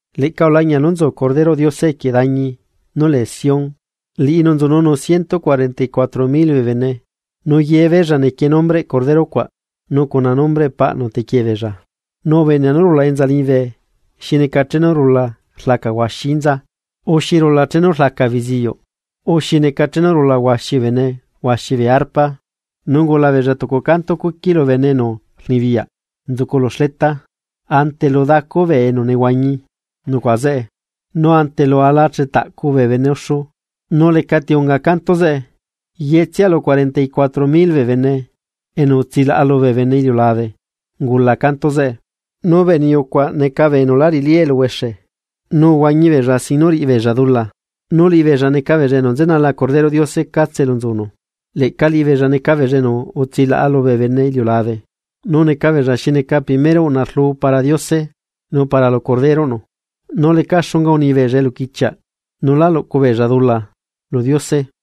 Leꞌca ulañia nú nzu Corderoꞌ Diose equie dañi nú lee Sión. Liꞌinu nzununu ciento cuarenta y cuatro mil bee bene, nu yebeella nequie nombreꞌ Cordero cuaꞌ nu cuna nombreꞌ Paꞌnu tequie beella. Nu ubenea nú rula enza liñibe xi neca chenu rula rlaca huaxi inza o xi rula chenu rlaca beziuꞌ o xi neca chenu rula huaxi bene huaxi bee arpas. Nu ungula beella tucu canto cuqui lu bene enu rnibiyaꞌ nzucu lu xleta ante lu dacu bee enu nehuañi nucuaꞌa zeꞌe nu ante lu ala chetaꞌcu bee bene uxu. Nu lecati unga canto zeꞌe, yetsia lu cuarenta y cuatro mil bee bene enu utsilaꞌa lubee bene iliulabe ungula canto zeꞌe. Nu bee niyu cuaꞌ neca bee enu lá riꞌilí eluhuexe, nu uhuañi beella sin nú riꞌibeella dula, nu liꞌibeella neca beella enu nzenala Corderoꞌ Diose catse elu nzanu. Leꞌca liꞌibeella neca beella enu utsilaꞌa lubee bene iliulabe, nu neca beella xi neca primero uꞌna rlu para Diose nu para lu Corderoꞌnu. Nu leca xunga uni beella eluquichiaꞌ nu la luꞌcu beella dula lu Diose.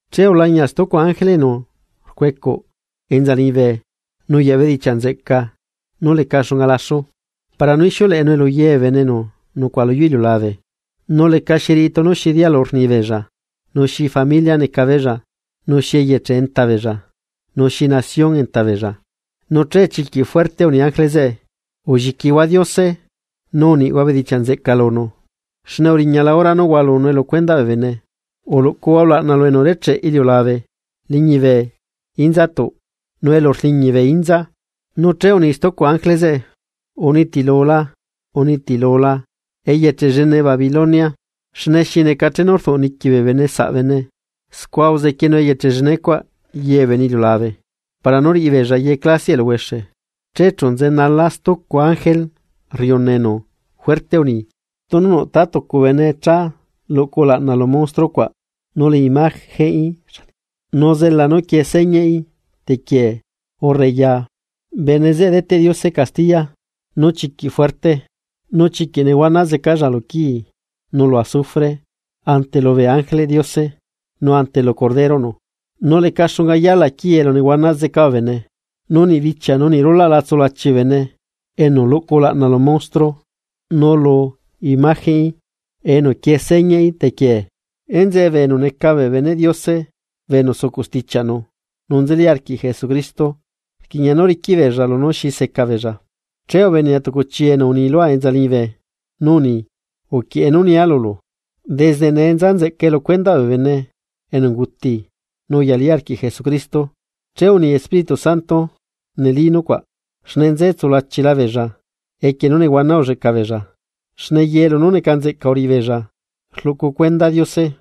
Che ulañia stucu ángele enu rcuecuꞌ enza liñibe nuyaꞌ bedichiaꞌ nzeꞌca nú leca xunga laxu, para nú ixiuleꞌenue lu ye bee bene enu nucuaꞌa luyuu iliulabe, nu lecaxi riꞌi tunu xi dialu rni beella, nu xi familia neca beella, nu xi eyeche enta beella nu xi nación enta beella. Nu che chiquiꞌ fuerte uni ángele zeꞌe: ―Ulliquihua Diose, nu uniꞌhua bedichiaꞌ nzeꞌca lunu, xne uriñala hora nú hualunue lu cuendaꞌ bee bene. Uluꞌcuhua ulaꞌna lu enu urecheꞌ iliulabe, liñibe, inzatuꞌ nu elu rliñi bee inza. Nu che uni stucu ángele zeꞌe: ―Unitilula, unitilula eyeche llene Babilonia xne xi neca chenu rduꞌ niqui bee bene saꞌ bene, scua uzequienu eyeche llenecuaꞌ ye bee bene iliulabe para nú riꞌibeei ye clasiaꞌ eluhuexe. Che chu nzenala stucu ángele rriuna enu fuerte uni: ―Tunu nuꞌ tá tucu bene cha luꞌcu ulaꞌna lu monstruo cuaꞌ nu lu imagenꞌí nu zela nú quie señaꞌí tequiee urre ya, bene zeꞌe deteꞌ Diose castiya nú chiquiꞌ fuerte, nu chiquiꞌ nehuana zecalla luquii, nu lu azufre ante lubee ángeleꞌ Diose nu ante lu Corderoꞌ Diose. Nu leca xunga yala quii elu nehuana zeca bee bene. Nu niꞌ bichia nu niꞌ rulaꞌ la tsulachi bee bene enu luꞌcu ulaꞌna lu monstruo nu lu imagenꞌí enu quiee señaꞌí tequiee. Enzeꞌe bee enu neca bee beneꞌ Diose bee enu sucuꞌ stichiaꞌnu nu nzeli arquiꞌ Jesucristo. Rquiꞌña nú riquiꞌ beella lunú xi seca beella. Che ubenea tucu chi enu uni lua enza liñibe, nu uni: ―Uquieꞌe nú nia lulu: “Desde nee nza nzeꞌcae lu cuendaꞌ bee bene enu unguti nu uyali arquiꞌ Jesucristo.” Che uni Espíritu Santo, neli nucuaꞌ, xne nze tsulachila beella equie nú nehuana ulleꞌca beella, xne ye lunú neca nzeꞌca uriꞌibeella rluꞌcu cuenda Diose.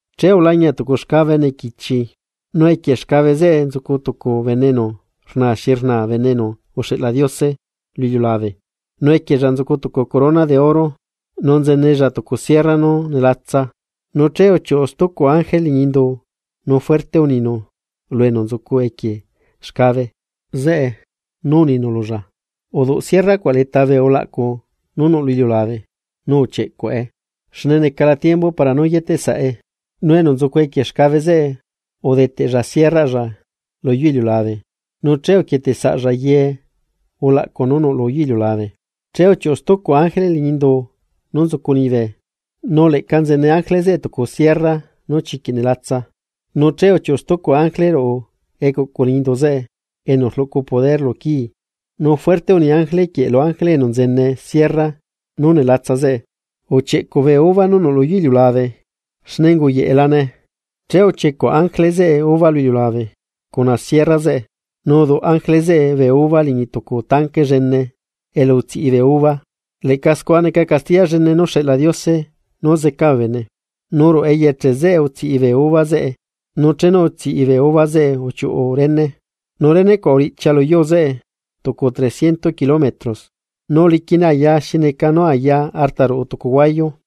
Che ulañia tucu xcabe nequichi nu equie xcabe zeꞌe nzucu tucu bene enu rnaa xi rnaa bene enu uxeꞌla Diose lu iliulabe. Nu equiella nzucu tucu corona nú neca oro, nu nzenella tucu sierra nú nelatsa. Nu che uchiuꞌu stucu ángele liñi indu nu fuerte uninu lu enu nzucu equie xcabe zeꞌe, nu uninu lulla: ―Uduꞌ sierra cuaꞌ leta bee ulaꞌcu nú nuꞌ lu iliulabe, nu uchieꞌcuꞌe, xne necala tiembu para nú yeteꞌ saꞌe. Nu enu nzucu equie xcabe zeꞌe udeteꞌlla sierraꞌlla luyuu iliulabe, nu che uquieteꞌ saꞌlla ye ulaꞌcu nú nuꞌ lu iliulabe. Che uchiuꞌu stucu ángele liñi indu nú nzucu liñibe, nu leꞌca nzene ángele zeꞌe tucu sierra nú chiquiꞌ nelatsa. Nu che uchiuꞌu stucu ángele ruꞌu ecuꞌcu liñi indu zeꞌe enu rluꞌcu poder lu quii, nu fuerte uni ángele quieꞌ lu ángele enu nzene sierra nú nelatsa zeꞌe: ―Uchieꞌcuꞌ bee uva nú nuꞌ lu yuu iliulabe xne unguyeꞌelane. Che uchiecuꞌ ángele zeꞌe uva lu iliulabe cuna sierra zeꞌe. Nu uduꞌ ángele zeꞌe bee uva liñi tucu tanque llene elu tsiꞌi bee uva. Leꞌca scua neca castiya llene nú xeꞌla Diose nú zeca bee bene. Nu ruꞌu eyeche zeꞌe utsiꞌi bee uva zeꞌe nu chenu utsiꞌi bee uva zeꞌe uchiuꞌu rene. Nu rene cuaꞌ uriꞌchia luyuu zeꞌe tucu trecientos kilómetros, nu uliquine aya hasta elu nziꞌqui artaruꞌu tucu huayu.